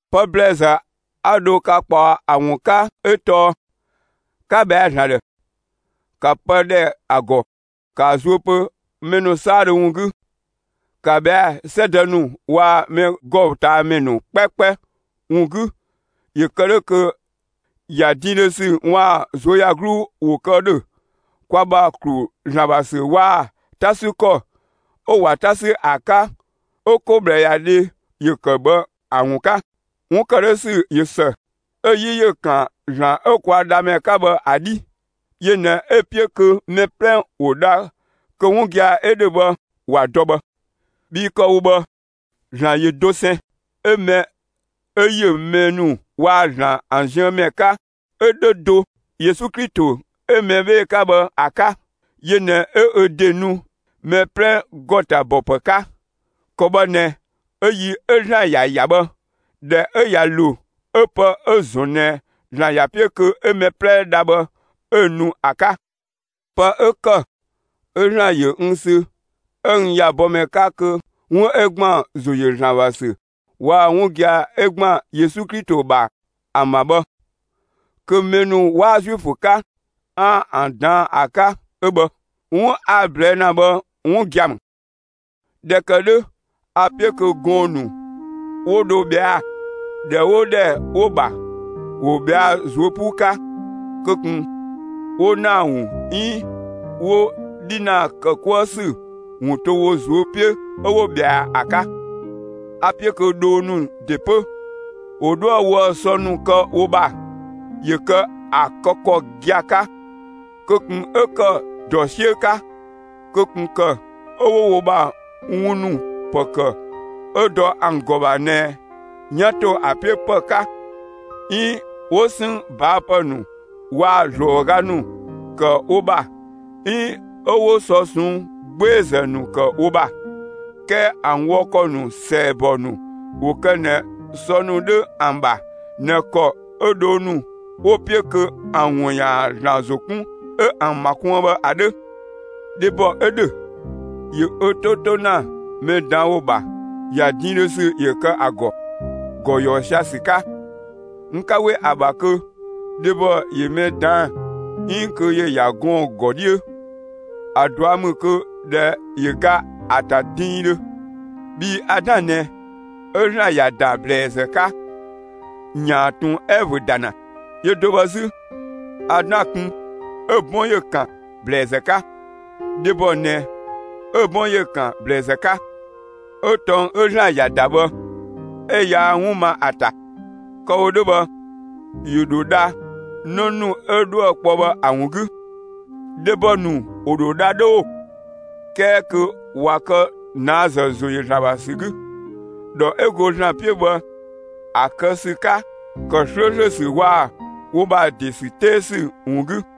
Pë ‑blɛɛzë 'a dho ka ꞊kpaɔ ‑a ‑wun 'ka 'ö tɔɔ 'ka ‑bhɛa ‑Zlan ‑dhë; ‑ka pë ‑dhɛ ‑a ‑gɔ; ‑kaa zuö pö mɛ ‑nu 'saadhö ‑wun 'gü! ‑Ka ꞊bhɛa'‑ 'sɛdë ‑nu waa‑ mɛgɔtamɛ ‑nu 'kpɛkpɛ ‑wun 'gü ‑yö kë 'dhö kö ‑ya diindhö ‑sü waa‑ ꞊zuöyagluu ‑wo kë ‑dhö kwa ‑bha ‑klu ‑Zlan ‑bha ‑sü waa‑ 'ta 'sü ‑kɔ 'ö ꞊wa 'ta ‑sü ‑a 'ka 'ö 'ko ꞊bhlëyadhe ‑yö ‑kë bhë ‑an ‑wun 'ka; 'wun ‑kë 'dhö ‑sü ꞊yö ‑së; 'ö‑ 'yi ‑yö ‑kan ‑Zlan 'ö kwa Dhamɛ 'ka bhë ‑a 'dhi. Yö ꞊nɛ 'ö‑ 'piö kö mɛ 'plɛ ‑wo dha kö 'wun gia‑ 'ö ‑dhö bhë ‑wa dɔ bhë. Bhii kë‑ wo bhë, ‑Zlan ‑yö dosɛn, 'ö mɛ 'ö ‑yö mɛ ‑nu waa‑ ‑Zlan ‑an ziën ‑mɛ 'ka 'ö 'dhö do Yesu Klito 'ö mɛ 'bhee‑ 'ka bhë ‑a 'ka. Yö ꞊nɛ 'ö ö ‑de nu mɛ 'plɛ ‑gɔ ‑ta ‑bɔ ‑pë 'ka. ‑Kɔ bhë ꞊nɛ 'ö yi 'ö ‑Zlan ‑ya ‑ya bhë, ꞊dhɛ 'ö ꞊ya ‑lo, 'ö pë 'ö‑ ‑zɔn ꞊nɛ ‑Zlan ‑ya 'piö kö 'ö mɛ 'plɛ dha bhë, 'ö nu ‑a 'ka. Pë 'ö ‑kë 'ö ‑Zlan ‑yö n sü 'ö n ‑ya bɔmɛ 'ka kö 'wun 'ö ‑gban ‑zo ‑yö ‑Zlan ‑bha ‑sü waa‑ 'wun gia‑ 'ö ‑gban Yesu Klito ‑bha ‑an ‑bha bhë, kö mɛ ‑nu 'waa Zuifö 'ka, 'aan‑ ‑an ꞊daan'‑ ‑a 'ka 'ö bhë. 'Wun 'a‑ ꞊blɛɛ' ‑na bhë 'wun gia‑ ‑mü. ꞊Dhɛ ‑kë 'dhö, a‑ 'piö kö gɔɔn‑ ‑nu 'wo dho ꞊bhɛa'‑, ‑dhɛ 'oo ‑dhɛ 'wo‑ ‑bha, ‑wo ꞊bhɛa'‑ ꞊zuö' 'puu 'ka. Kö ꞊kun 'wo ‑naa ‑wun 'iin 'wo 'dhinaa ‑kë 'kuë ‑sü ‑wun to wo ꞊zuö' 'piö 'ö 'wo ꞊bhɛa ‑a 'ka! A‑ 'piö kö dhoo ‑nu ‑de 'pö, ‑wo 'dhoë‑ woë‑ sɔ ‑nu kë wo ‑bha, ‑yö kë ‑a kë ‑kɔ gia‑ 'ka; kö ꞊kun 'ö ‑kë ‑dɔ 'siö 'ka. Kö ꞊kun ‑kë 'ö 'wo wo ‑bha wun ‑nu ‑pë ‑kë 'ö dɔ ‑an ‑gɔ ‑bha ꞊nɛ 'yan ‑to ‑a 'piö ‑pë 'ka 'iin 'wo 'sënng ꞊baa' ‑pë ‑nu waa‑ ‑zlɔɔga ‑nu ‑kë wo ‑bha 'iin 'ö 'wo sɔ ꞊sɔnng' 'gbeezë ‑nu ‑kë wo ‑bha. 'Kɛɛ ‑an wɔ ‑kɔ ‑nu ‑sɛɛbɔ ‑nu ‑wo kë ꞊nɛ sɔ ‑nu 'dhö ‑an ‑bha ꞊nɛ ‑kɔ 'ö dhoo ‑nu 'wo‑ 'piö kö ‑an ‑wun ‑yaan ‑Zlan ‑zo 'kun, 'ö ‑an ‑ma kuën bhë ‑a 'dhö. Dhebɔ 'ö ‑dhö, ‑yö ö 'to 'to ‑na mɛ ꞊daan' ‑wo ‑bha, ‑ya diindhö ‑sü ‑yö kë ‑a ‑gɔ, ‑gɔ ‑yɔɔ sia‑ ‑sü 'ka! N 'ka 'we ‑a ‑bha kö dhebɔ ‑yö mɛ ꞊daan'‑ 'iin kö ‑yö ‑ya gɔɔn‑ ‑gɔ 'dhiö; ‑a ꞊dua' ‑mü kö ‑dhɛ ‑yö ga ‑a ‑ta diindhö. Bhii Adan ꞊nɛ 'ö ‑Zlan ‑ya ‑da ‑blɛɛzë 'ka ‑yaan ꞊tun Ɛvö ‑da ‑na; yö do bhë 'zü, Adan kun 'ö‑ 'bɔn ‑yö ‑kan (‑blɛɛzë 'ka); dhebɔ ꞊nɛ 'ö‑ 'bɔn ‑yö ‑kan (‑blɛɛzë 'ka); 'ö tɔng 'ö ‑Zlan ‑ya ‑da bhë, 'ö yaa 'wun ma ‑a ‑ta. Kë‑ wo 'dhö bhë ‑yö ‑dho dha 'në ‑nu 'ö dhoë‑ 'kpɔ bhë ‑a ‑wun 'gü. Dhebɔ ‑nu ‑wo ‑dho dha 'dhö ‑oo, 'kɛɛ kö ꞊wa kë ꞊naazë ‑zo ‑yö ‑Zlan ‑bha ‑sü 'gü, ‑dhɔ 'ö go ‑Zlan 'piö bhë ‑a kë ‑sü 'ka, ‑kë 'slööslö ‑sü waa‑ wo ‑bha ‑de ‑sü 'tee ‑sü ‑wun 'gü.